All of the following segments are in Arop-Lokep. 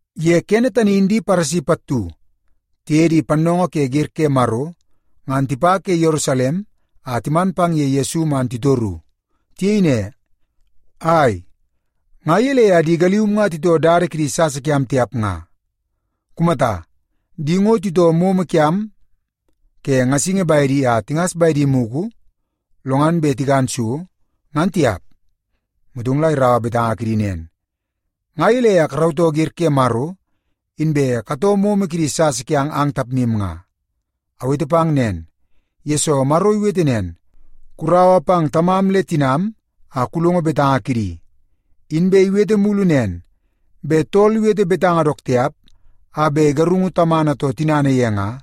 Ye kene tani in di Paresi pattu tiye di pannoongoo ke ger ke Maro, ngan tipa ke Yerusalem a timan pang ye Yesu man titoru. Tiyei ne, “Ai, nga yelei a di galium nga titoo dada kidi sasa kiam tiap nga? Kumata, di ngo titoo momo kiam ke ngasingi baede a tingas baedi muku lo ngan be tikan so, ngan tiap!” Motong la iraua betanga kidi nen, “Nga yelei a karautoo ger ke Maro, inbe katoo momo kidi sasa kiang ang tapmim nga? Awete nen nga, yesoo Maro iwete nen, ‘Kuraua pang tamam le tinam a kulongo betanga kidi.’ a Inbe iwete mulu nen, ‘Be tool iwete betanga dook tiap a be igarungu tamana too tinana ye nga,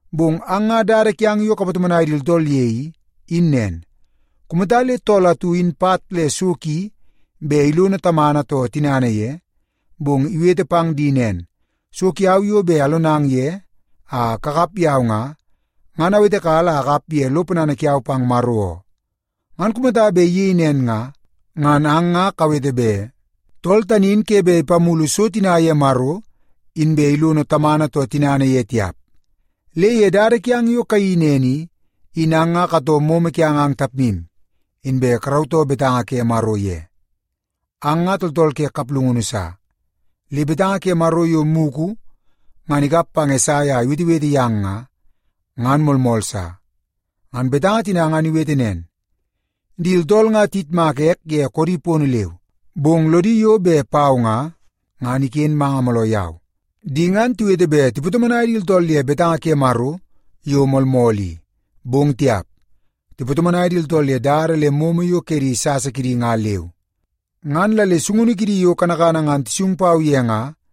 Bong ang nga dada kiang yo kapatomonai di tooltool ye i, in nen. Kumata le tool atu in pat le so ki be ilono tamana too tinana ye, bong iwete pang di nen, ‘So kiau yo be alonang ye a kakap yau nga, ngan awetekala a akap ye lo ponana kiau pang Maro oo,’ ngan kumata be iyei nen nga, ngan ang nga kawete be tool tani in ke be ipamulu so tina ye Maro inbe ilono tamana too tinana ye tiap. Le ye dada kiang yo kayeii nen i, in ang nga katoo momo kiang ang tapmim, inbe karautoo betanga ke Maro ye. Ang nga tooltool ke kaplungunu sa! Le betanga ke Maro yo muku ngan ikap pang Esai a iwetewete yang nga, ngan moolmool sa. Ngan betanga tina ngan iwete nen, ‘Di tooltool nga tiyitmaka ek ye koodi pono leu, bong lodi yo be pau nga, ngan iken manga mooloo yau. Di ngan tiwete be tipatomonai di tooltool ye betanga ke Maro yo moolmool i, bong tiap, tipatomonai di tooltool ye dada le momo yo ke di sasa kidi nga leu. Ngan la le sungunu kidi yo kanakana ngan tisung pau ye nga,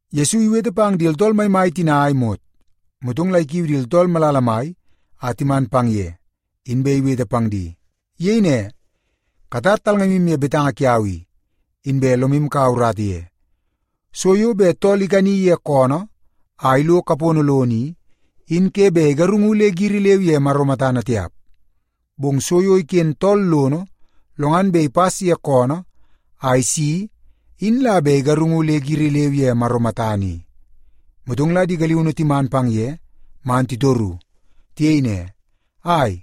Yesu iwete pang di tooltool maimai tina a imot, motong la ikiu di tooltool malala mai a timan pang ye, inbe iwete pang di. Iyei ne, “Katar talngamim ye betanga kiau i, inbe lomim kaua urata ye. So yo be tool ikani ye koonoo a ilo kapono lono i, in ke be igarungu le giri leu ye Maro matana tiap. Bong so yo iken tool lono, lo ngan be ipas ye koonoo a isi in la be igarungu le giri leu ye Maro matana i.” Motong la di galiunu timan pang ye man titoru. Tiyei ne, “Ai,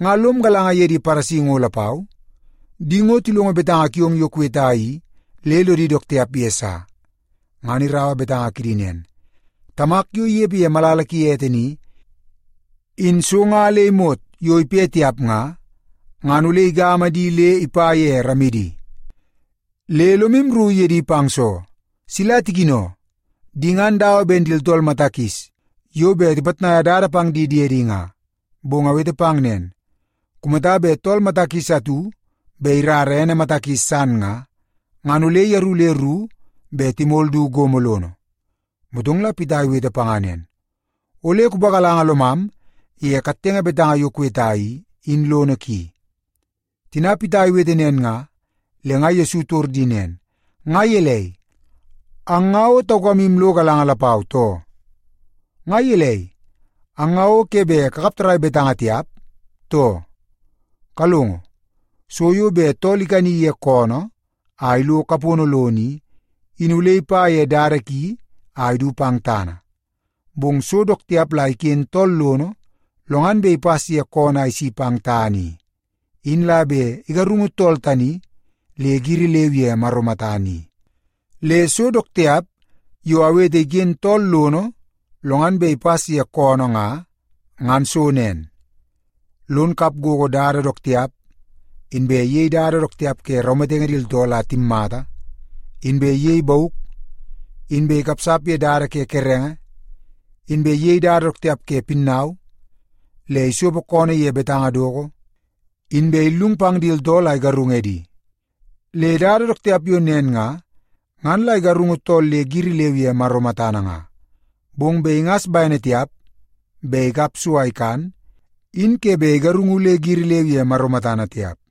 nga lom galanga ye di Paresi ngo lapau? Di ngo tilongo betanga kiong yo kuweta i le lodi dook tiap ye sa.” Ngan iraua betanga kidi nen, “Tamak yo iyepe ye malala ki ete ni, in so nga le imot yo ipe tiap nga, ngan ole igama di le ipa ye ramidi. Le lomim rru ye di pang soo? Sila tikino! Di ngan dawa ben di tooltool mata kis yo be tipatnaia dada pang di diedi nga. Bong awete pang nen, kumata be tool mata kis atu be irara ene mata kis san nga, ngan ole yaru le ru, be timol du gomo lono.” Motong la Pita iwete panga nen, “Ole kupagalanga lomam ye kattenge betanga yo kuweta i, in lono ki.” Tina Pita iwete nen nga, le nga Yesu itor di nen, “Nga yelei, ang nga o taukamim lo galanga lapau, too? Nga yelei, ang nga o ke be kakap tarai betanga tiap, too? Kalongo, so yo be tool ikani ye koonoo a ilo kapono lono i, in ole ipa ye dada ki a idu pang tana. Bong so dook tiap la iken tool lono, lo ngan be ipas ye koonoo a isi pang tana i, in la be igarungu tool tani le giri leu ye Maro matana i. Le so dook tiap yo awete iken tool lono lo ngan be ipas ye koonoo nga, ngan so nen: lon kap gogo dada dook tiap, inbe iyei dada dook tiap ke raumatenge di tooltool a timmata, inbe iyei bauk, inbe ikapsap ye dada ke kerenge, inbe iyei dada dook tiap ke pinnau, le isopo koonoo ye betanga doko, inbe illung pang di tooltool a igarung edi. Le dada dook tiap yo nen nga, ngan la igarungu tool le giri leu ye Maro matana nga. Bong be ingas baene tiap be ikap so a ikan, in ke be igarungu le giri leu ye Maro matana tiap.”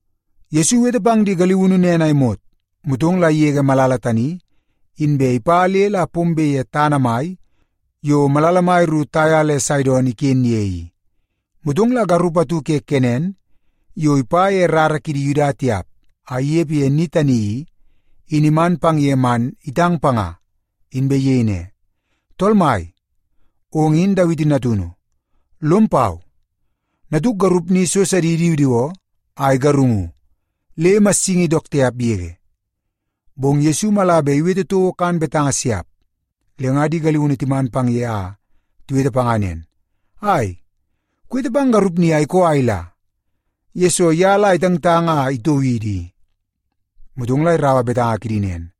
Yesu iwete pang di galiunu nen a imot, motong la iyege malala tani, inbe ipa le la pombe ye tana mai yo malala mai ru Taia le Saidon iken ye i. Motong la garup atu ke Kenan yo ipa ye rara kidi Yuda tiap a iyepe ye ni tani i, in iman pang ye man itang panga, inbe iyei ne, “Tool Mai, ong in Dawiti Natunu. Lom pau! Natuk garup ni so sadi idiwidiwoo a igarungu, le imassingi dook tiap yege.” Bong Yesu mala be iwete touo kan betanga siap. Le nga di galiunu timan ye a tiwete panga nen, “Ai, kuwete pang garup ni a ikoo a ila, yesoo ya la itangtang a itoo idi i.” Motong la iraua betanga kidi nen,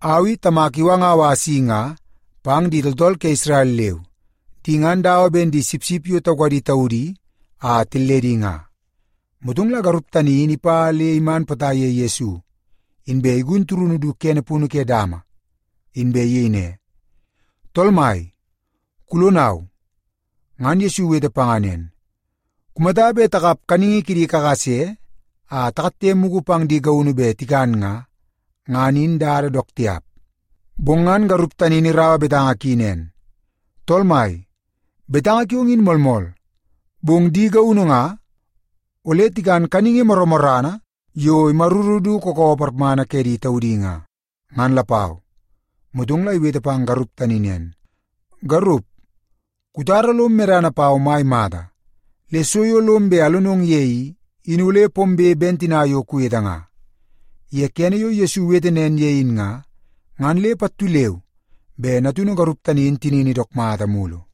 “Au i Tamak iwangau a asi nga pang di tooltool ke Isrel leu. Di ngan dawa ben di sipsip yo taukadi taudi a tilledi nga.” Motong la garup tani in ipa le iman potai ye Yesu, inbe igun turunu du kene punu ke dama, inbe iyei ne, “Tool Mai, kulonau!” Ngan Yesu iwete panga nen, “Kumata be takap kaningi kidi kakase a takatte muku pang di gaunu be tikan nga, ngan in dada dook tiap.” Bong ngan garup tani in iraua betanga ki nen, “Tool Mai, betanga kiong in moolmool. Bong di gaunu nga, ole tikan kaningi moromorana yo imaruru du kookoowoo parmana ke di taudi nga, ngan lapau.” Motong la iwete pang garup tani nen, “Garup, kutara lom medana pau mai mata. Le so yo lom be alonong ye i, in ole pombe ben tina yo kuwete nga.” Ye kene yo Yesu iwete nen ye in nga, ngan le pattu leu be natunu garup tani in tinini dook mata mulu.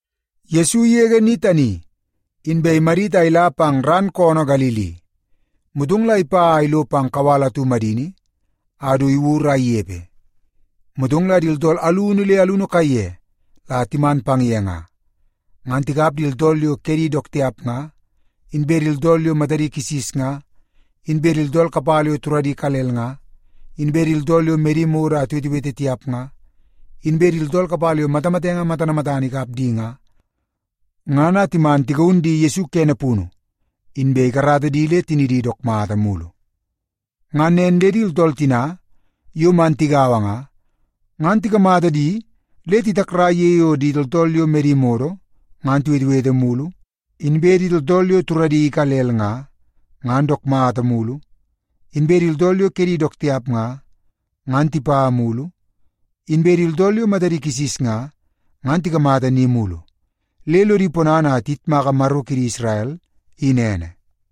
Yesu iyege ni tani, inbe imadit a ila pang ran koonoo Galili. Motong la ipa a ilo pang kawal atu madini a du iwur a iyepe. Motong la di tooltool alunu le alunu kaiye la timan pang ye nga, ngan tikap di tooltool yo kedi dook tiap nga, inbe di tooltool yo matadi kisis nga, inbe di tooltool kapala yo turadi ikalel nga, inbe di tooltool yo medi modo a tiwetewete tiap nga, inbe di tooltool kapala yo matamatenge matana matana ikap di nga, ngan a timan tigaun di Yesu kene punu, inbe ikarata di le tinidi dook mata mulu. Ngan nen le di tooltool tina yo man tigaua nga, ngan tikamata di le titakrai ye yo di tooltool yo medi modo ngan tiwetewete mulu; inbe di tooltool yo turadi ikalel nga, ngan dook mata mulu; inbe di tooltool yo kedi dook tiap nga, ngan tipa mulu; inbe di tooltool yo matadi kisis nga, ngan tikamata ni mulu. Le lodi ponana a tiyitmaka Maro kidi Isrel, in ene.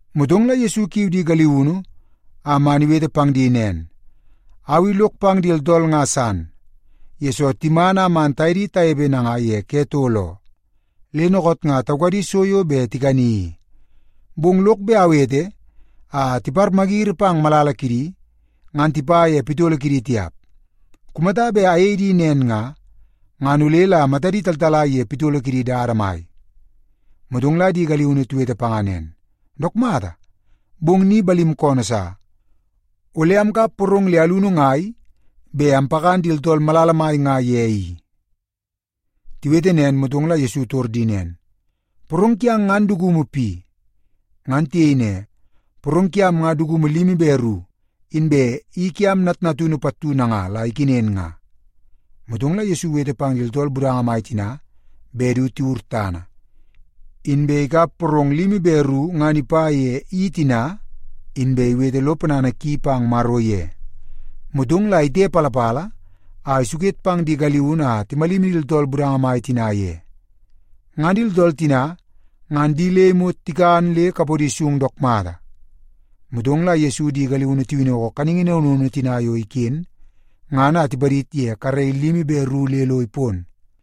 Motong la Yesu ikiu di galiunu a man iwete pang di nen, “Au i lok pang di tooltool nga san, yesoo timan a man taye di tayepe nanga ye ke tol oo, le nookoot nga taukadi so yo be tikani i. Bong lok be awete a timagiri pang malala kidi, ngan tipa ye pitolo kidi tiap. Kumata be ayei di nen nga, ngan ole la matadi taltalai ye pitolo kidi dada mai.” Motong la di galiunu tiwete panga nen, “Dook mata, bong ni balim koonoo sa. Ole amkap porong le alunu ngai be ampakan di tooltool malala mai nga ye i?” Tiwete nen, motong la Yesu itor di nen, “Porong kiang ngan dukumu pi?” Ngan tiyei ne, “Porong kiam nga dukumu limi be ru, inbe i kiam natnatunu pattu nanga la ikenen nga.” Motong la Yesu iwete pang di tooltool budanga mai tina be du tiwur tana. Inbe ikap porong limi be ru ngan ipa ye i tina, inbe iwete lo ponana ki pang Maro ye. Motong la itepalapala a isuket pang di galiunu a timalimi di tooltool budanga mai tina ye. Ngan di tooltool tina ngan di le imot tikan le kapodi sung dook mata. Motong la Yesu di galiunu tiwinoko kaningi naunu naunu tina yo iken, ngan a tipadid ye karei limi be ru le lo ipon.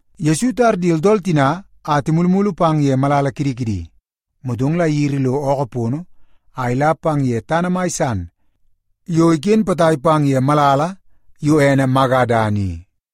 Yesu itar di tooltool tina a timulumulu pang ye malala kidi kidi, motong la iyiri lo ookoo pono a ila pang ye tana mai san yo iken potai pang ye malala yo ene Magadan i.